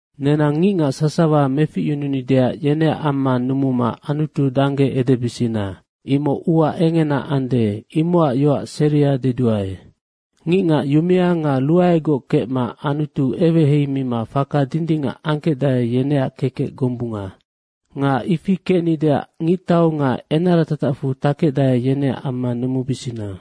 Nenang ngicngac sasawa meficyununideac yeneac amma numuma Anutu dangge edebisina. Imoc ua engena ande, imocac yoac seria deduae. Ngicngac yumea nga ruaegoc kecma Anutu eweheimima faka dindingac angkecdae, yeneac kekec gombunga. Nga ifi kecnideac ngictau nga enara tatacfu takecdae, yeneac amma numubisina.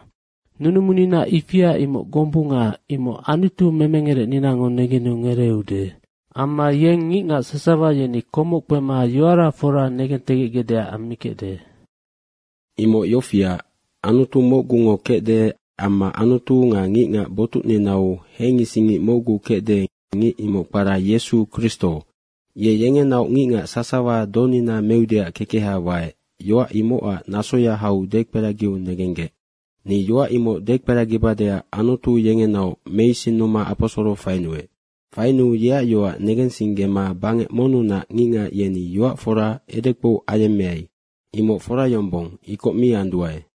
Nunumunina ifia imoc gombunga, imoc Anutu memengerecninango negenu ngereeude. Amma yeng ngicngac sasawa yeni komoc kpema yoara fora negentegecgecdeac ammikecde. Imoc yofiac, Anutu mocgungo kecde amma Anutu nga ngicngac botucninau hengisingngic mocgu kecde, ngic imoc kpara Yesu Kristo. Ye yengenaoc ngicngac sasawa donina meudeac kekeha waec. Yoac imocac nasoya hau dekperagiu negenggec. Ni yoac imoc dekperagibadeac Anutu yengenaoc meisinnuma aposoro fainuec. Fainuu yeac yoac negensinggema bangec monnunac ngicngac, yeni yoac fora edekpou ayemmeai. Imoc fora yombong, ikoc mi anduae.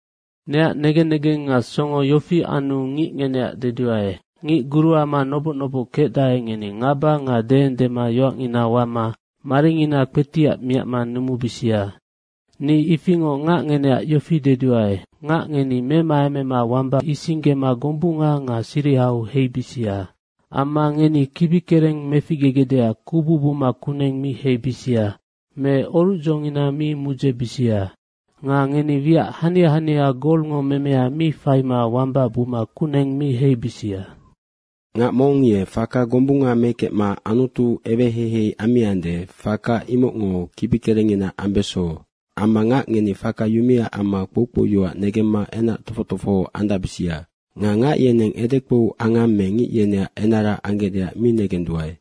Neac negen negeng nga songo yofi anu ngic ngeneac deduae, ngic guruama noboc noboc kecdae, ngeni ngaba nga deendema yoacngina wama maringina kpetiac miacma numubisia. Ni ifingoc ngac ngeneac yofi deduae, ngac ngeni memaemema wamba isinggema gombunga nga sirihau heibisia. Amma ngeni kibikereng meficgegecdeac kubu buma kuneng mi heibisia me orucdzongina mi mudzebisia. Nga ngeni wiac hania hania golngo memea mi faima wamba buma kuneng mi heibisia. Ngac mong ye faka gombunga mekecma Anutu eweheihei ammiande, faka imocngo kibikerengngina ambeso. Amma ngac ngeni faka yumea amma kpoukpou yoac negemma enac tofoc tofoho andacbisia. Nga ngac yeneng edekpou angang me ngic yeneac enara anggecdeac mi negenduae.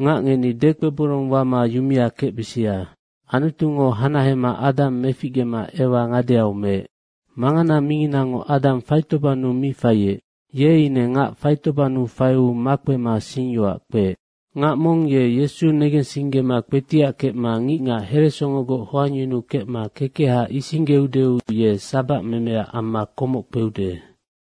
Ngac ngeni dekpeborong wama yumea kecbisia. Anutungo hanahema Adang meficgema Ewa ngadeau meec. Mangana minginango Adang faitobannu mi faiec. Ye ine ngac faitobannu faiu makpema singyoac kpeec. Ngac mong ye Yesu negensinggema kpetiac kecma ngicngac heresongogoc hoangyunukecma kekeha isinggeudeu ye sabac memeaac amma komoc kpeude.